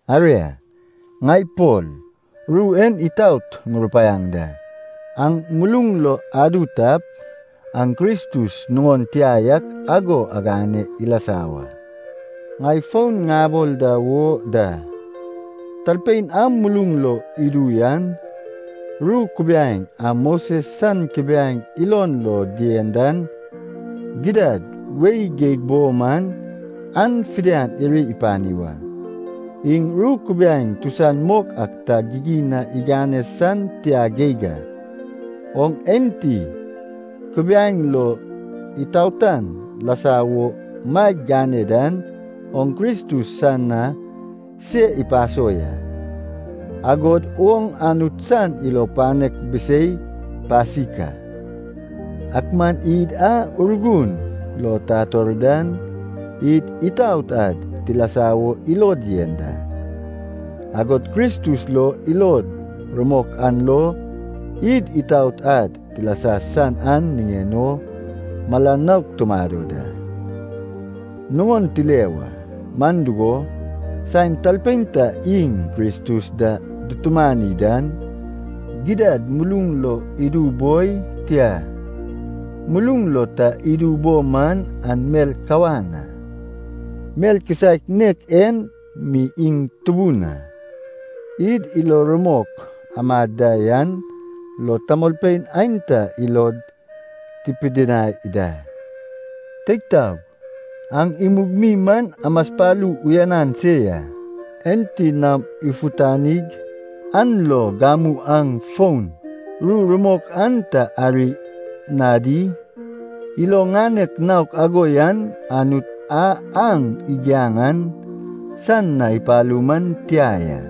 Aria, ŋai Pol ru en itaot ŋurupaiaŋ da. Aŋ muluŋ lo adu tap, aŋ Kristus nuŋon tia yak ago agane ilasa wa. Ŋai fon ŋabol da wo da, talpein a muluŋ lo idu yan, ru kubiaeŋ a Moses san kubiaeŋ ilon lo dien dan, gidad wei geig bo man, an fidian iri ipani wa. Iŋ ru kubiaeŋ tusan mok ak ta gigin na igane san tia geig a. Oŋ enti Kubiaeŋ lo itaotan lasa wo maeg gane dan, oŋ Kristus san na se ipaso ya. Agod oŋ Anut san ilo panek bisei pasik a. Ak man id a Urgun lo tator dan, id itaot ad tilasa wo ilod yen da. Agod Kristus lo ilod rumok an lo, id itaot ad tilasa san an niŋen o mala nouk tumado dan, nuŋon tile wa. Man dugo, saen talpein ta iŋ Kristus da dutumani dan, gidad muluŋ lo idu boi, tia, muluŋ lo ta idu bo man an mel kawan a. Mel kisaek nek en mi iŋ tubun a, id ilo rumok amad da yan lo tamolpein aenta ilod tipidinai da. Teig taog, aŋ imug mi man amaspalu uyanan se ya. Enti naom ifutanig, an lo gamu aŋ fon ru rumok an ta ari na di? Ilo ŋanek naok ago yan Anut a aŋ igiaŋ an san na ipalu man tia ya.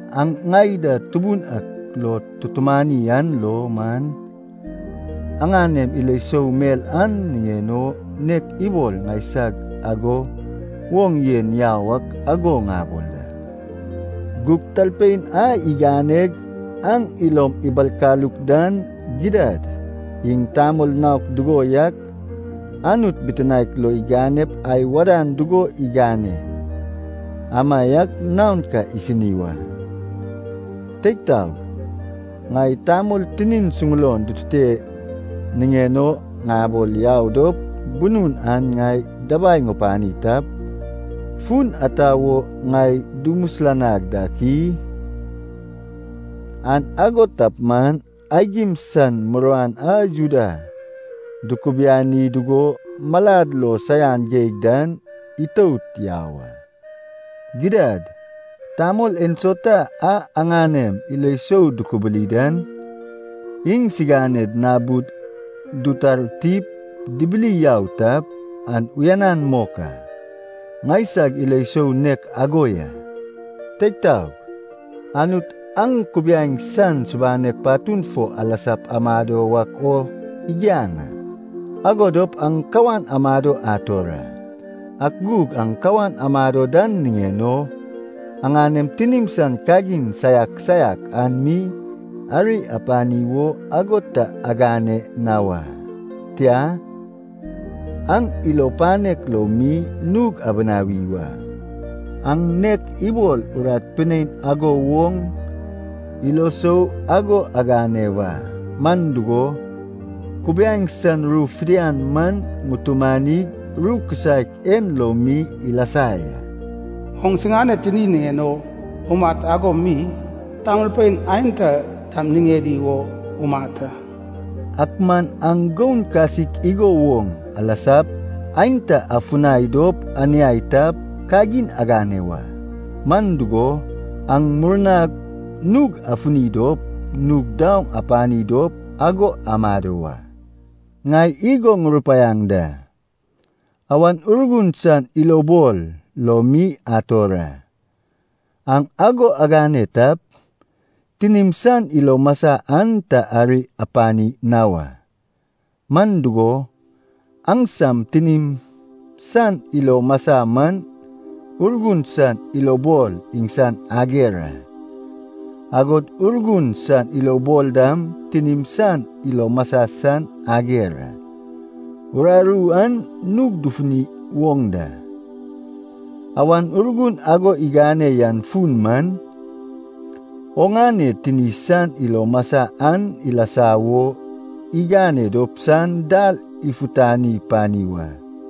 Aŋ ŋai da Tubun ak lo tutumani an lo man, aŋanem ilo sou mel an niŋen o, nek ibol ŋaisag ago woŋ yen yau ak ago ŋabol da. Gug talpein a iganeg aŋ ilom ibalkaluk dan, gidad iŋ tamol naok dugo yak, Anut bitinaek lo iganep ai wadan dugo igane amaiak naon ka isini wa. Teig taog, ŋai tamol tinid suŋulon dutute niŋen o ŋabol yau dop bunun an ŋai dabai ŋupani tap, fun ata wo ŋai dumisilanag dak i? An ago tap man, aigim san muruan a Juda dukubiani dugo malad lo saian geig dan itout yau a. Gidad, tamol ensauta a aŋanem ilo sou dukubuli dan, iŋsiŋaned nabud dutartip dibiliau tap, an uyanan mok a. Ŋaisag ilo sou nek ago ya. Teig taog, Anut aŋ Kubiaeŋ san subanek patun fo alasap amado wak o igiaŋ a. Ago dop aŋ kawan amado ator a. Ak gug aŋ kawan amado dan niŋen o, aŋanem tinim san kagin saiak saiak an mi ari apani wo ago ta agane na wa. Tia, aŋ ilo panek lo mi nug abinawi wa, aŋ nek ibol urat pinein ago woŋ ilo sou ago agane wa. Man dugo, kubiaeŋ san ru fidian man itumanig ru kisaek en lo mi ilasa ya. “Oŋ siŋane tini niŋen o umat ago mi, tamolpein aenta dam niŋedi wo umat a.” Ak man aŋ goun kasik igo woŋ alasap, aenta afunai dop aniai tap, kagin agane wa. Man dugo, aŋ murnap nug afini dop nug daoŋ apani dop ago amado wa. Ŋai igo ŋurupaiaŋ da, Awan Urgun san ilobol lo mi ator a. Aŋ ago agane tap, tinim san ilo masai an ta ari apani na wa. Man dugo, aŋsam tinim san ilo masai man Urgun san ilobol iŋsan ager a, agod Urgun san ilobol dam tinim san ilo masai san ager a. Uraru an nug dufuni woŋ da. Awan Urgun ago igane yan fun man, oŋane tini san ilo masai an ilasa wo igane dop san dal ifutani pani wa.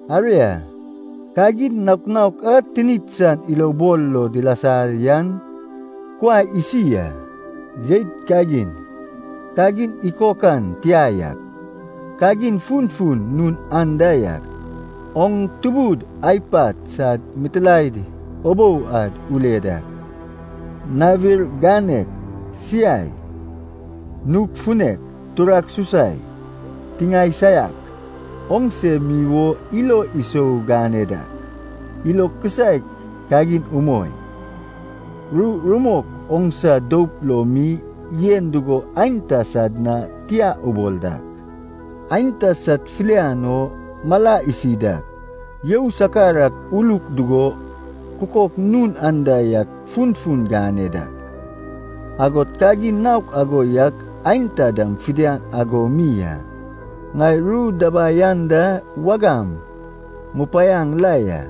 Aria, kagin naok naok a tinik san ilobol lo dilasa yan kuai isi a. Jeit kagin, kagin ikokan tia yak, kagin funfun nun anda yak, oŋ tubud ai pat sad mitilaed ubou ad ule dak, nawir ganek, siai, nug funek, turak susai, tiŋae saiak, oŋse mi wo ilo sou gane dak, ilo kisaek kagin umoi, ru rumok oŋsa doup lo mi yen dugo aenta sad na tia ubol dak, aenta sad filian o mala isi dak, you sakar ak uluk dugo kukok nun anda yak funfun gane dak, agod kagin naok ago yak aenta dam fidian ago mi a. Ŋai ru dabai anda wagam ŋupanaŋ la ya,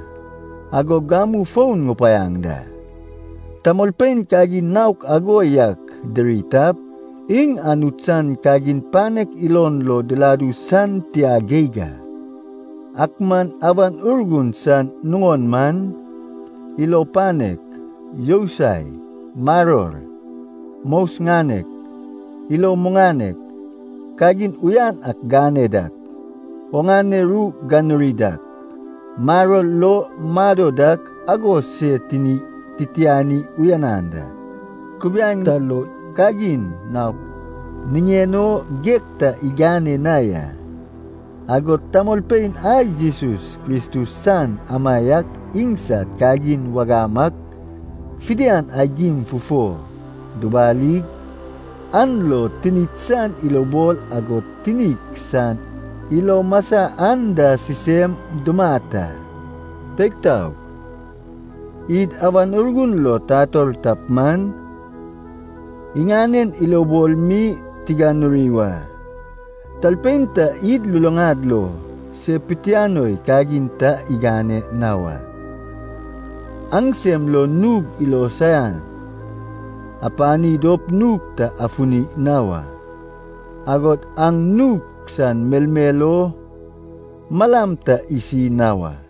agog gamu fon ŋupanaŋ da, tamolpein kagin naok ago yak diri tap, iŋ Anut san kagin panek ilon lo diladu san tia geig a. Ak man Awan Urgun san nuŋon man, ilo panek, yousai, maror, mos ganek, ilo muŋanek, kagin uyanan ak gane dak, oŋane ru ganuri dak, maror lo mado dak agod se tini titiani uyanan da. Kubiaeŋ ta lo kagin naok niŋen o geg ta igane na ya. Agod tamolpein a Jesus Kristus san amaiak iŋsad kagin wagam ak fidian aigim fufo dubalig, an lo tinik san ilobol agod tinik san ilo masa an da sisem dumat a. Teig taog, id Awan Urgun lo tator tap man, iŋanen ilobol mi tiganuri wa. Talpein ta id luluŋad lo se pitianoi kagin ta igane na wa. Aŋsem lo nug ilo saian apani dop nug ta afuni na wa. Agod aŋ nug san melmel o malam ta isi na wa.